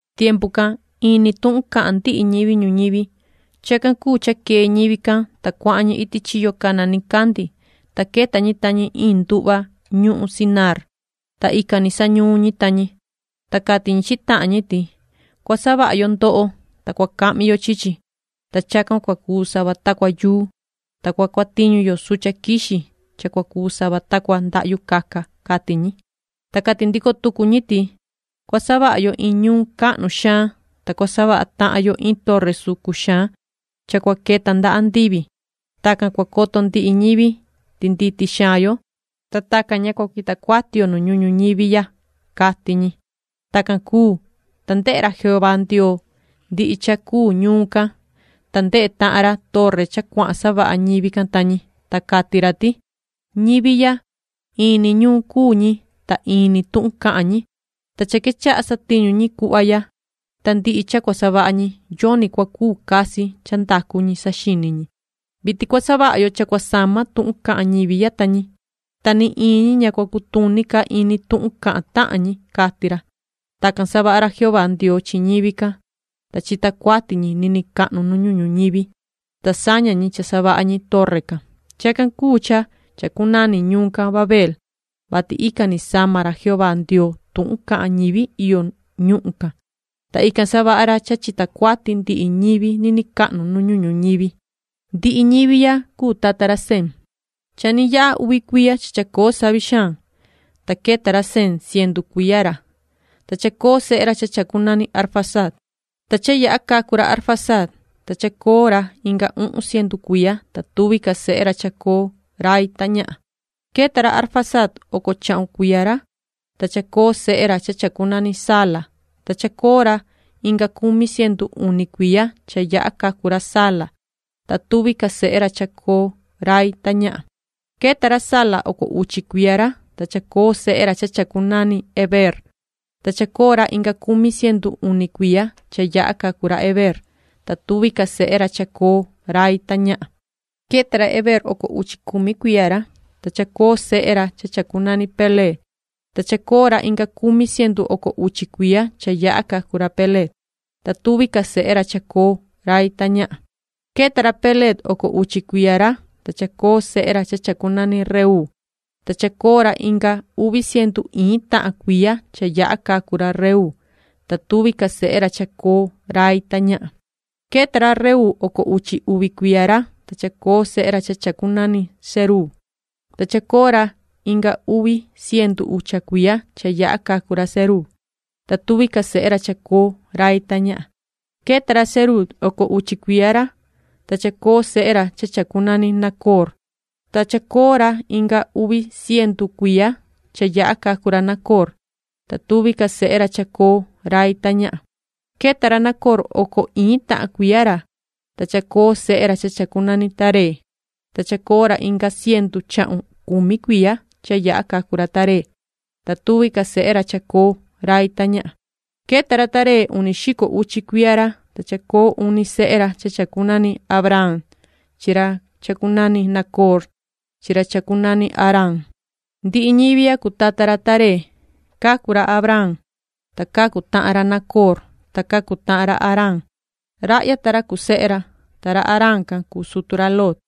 Tiempu can in ni tuhun cahan ndihi ñivi ñuñivi. Chacan cuu cha quee ñivi can, ta cuahan ñi iti chiyo cana nicandi, ta queta ñi ta ñi iin nduhva ñuhun Sinaar, ta ican ni sañuun ñi ta ñi. Ta cati ñi chi tahan ñi ti: “Cua savaha yo ndoho, ta cua cahmi yo chi chi, ta chacan cua cuu sava ta cua yuu, ta cua cuatiñu yo sucha quixi cha cua cuu sava ta cua ndahyu caca”, cati ñi. Ta cati ndico tucu ñi ti: “Cua savaha yo iin ñuun cahnu xaan, ta cua savaha tahan yo iin torre sucun xaan cha cua queta nda andivi. Tacan cua coto ndihi ñivi ti nditi xaan yo, ta tacan ña cua cuita cuati yo nu ñuhun ñuñivi ya”, cati ñi. Tacan cuu, ta ndehe ra Jehová Ndioo ndihi cha cuu ñuun can, ta ndehe tahan ra torre cha cuahan savaha ñivi can ta ñi. Ta cati ra ti: “Ñivi ya, in ni ñuun cuu ñi, ta in ni tuhun cahan ñi, ta cha quechaha satiñu ñi cuhva ya, ta ndihi cha cua savaha ñi, yoni cua cuu casi cha ndacu ñi saxini ñi. Vitin cua savaha yo cha cua sama tuhun cahan ñivi ya ta ñi, ta ni iin ñi ña cua cutuni ca ini tuhun cahan tahan ñi”, cati ra. Tacan savaha ra Jehová Ndioo chi ñivi can, ta chita cuati ñi niniin cahnu nu ñuhun ñuñivi, ta saña ñi cha savaha ñi torre can. Chacan cuu cha chacunani ñuun can Babeel, vati ican ni sama ra Jehová Ndioo tuhun cahan ñivi iyo nu ñuhun can, ta ican savaha ra cha chita cuati ndihi ñivi niniin cahnu nu ñuhun ñivi. Ndihi ñivi ya cuu tata ra Sem. Cha ni yaha uvi cuiya cha chacoo savi xaan, ta queta ra Sem cientu cuiya ra, ta chacoo sehe ra cha chacunani Arfaxad. Ta cha yaha cacu ra Arfaxad, ta chacoo ra inga uhun cientu cuiya, ta tuvi ca sehe ra chacoo rai ta ñahan. Queta ra Arfaxad oco chahun cuiya ra, ta chacoo sehe ra cha chacunani Sala. Ta chacoo ra inga cumi cientu uni cuiya cha yaha cacu ra Sala, ta tuvi ca sehe ra chacoo rai ta ñahan. Queta ra Sala oco uchi cuiya ra, ta chacoo sehe ra cha chacunani Heber. Ta chacoo ra inga cumi cientu uni cuiya cha yaha cacu ra Heber, ta tuvi ca sehe ra chacoo rai ta ñahan. Queta ra Heber oco uchi cumi cuiya ra, ta chacoo sehe ra cha chacunani Peleg. Ta chacoo ra inga cumi cientu oco uchi cuiya cha yaha cacu ra Peleg, ta tuvi ca sehe ra chacoo rai ta ñahan. Queta ra Peleg oco uchi cuiya ra, ta chacoo sehe ra cha chacunani Reuu. Ta chacoo ra inga uvi cientu iin tahan cuiya cha yaha cacu ra Reuu, ta tuvi ca sehe ra chacoo rai ta ñahan. Queta ra Reuu oco uchi uvi cuiya ra, ta chacoo sehe ra cha chacunani Seruug. Ta chacoo ra inga uvi cientu ucha cuiya cha yaha cacu ra Seruug, ta tuvi ca sehe ra chacoo rai ta ñahan. Queta ra Seruug oco uchi cuiya ra, ta chacoo sehe ra cha chacunani Nacoor. Ta chacoo ra inga uvi cientu cuiya cha yaha cacu ra Nacoor, ta tuvi ca sehe ra chacoo rai ta ñahan. Queta ra Nacoor oco iin tahan cuiya ra, ta chacoo sehe ra cha chacunani Taré. Ta chacoo ra inga cientu chahun cumi cuiya cha yaha cacu ra Taré, ta tuvi ca sehe ra chacoo rai ta ñahan. Queta ra Taré uni xico uchi cuiya ra, ta chacoo uni sehe ra cha chacunani Abraam chi ra cha chacunani Nacoor chi ra chacunani Haraan. Ndihi ñivi ya cuu tata ra Taré. Cacu ra Abraam, ta cacu tahan ra Nacoor, ta cacu tahan ra Haraan. Rahya ta ra cuu sehe ra. Ta ra Haraan can cuu sutu ra Lot.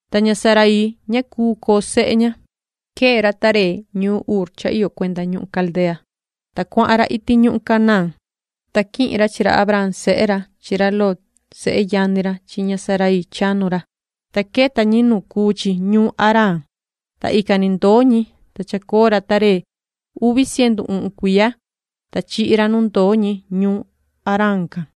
Ta ña Saraii ña cuu coo sehe ña. Quee ra Taré ñuun Ur cha iyo cuenda ñuhun Caldea, ta cuahan ra iti ñuhun Canaán, ta quihin ra chi ra Abraam sehe ra chi ra Lot sehe yani ra chi ña Saraii chanu ra, ta queta ñi nu cuu chi ñuun Haraan, ta ican ni ndoo ñi. Ta chacoo ra Taré uvi cientu uhun cuiya, ta chihi ra nu ndoo ñi ñuun Haraan can.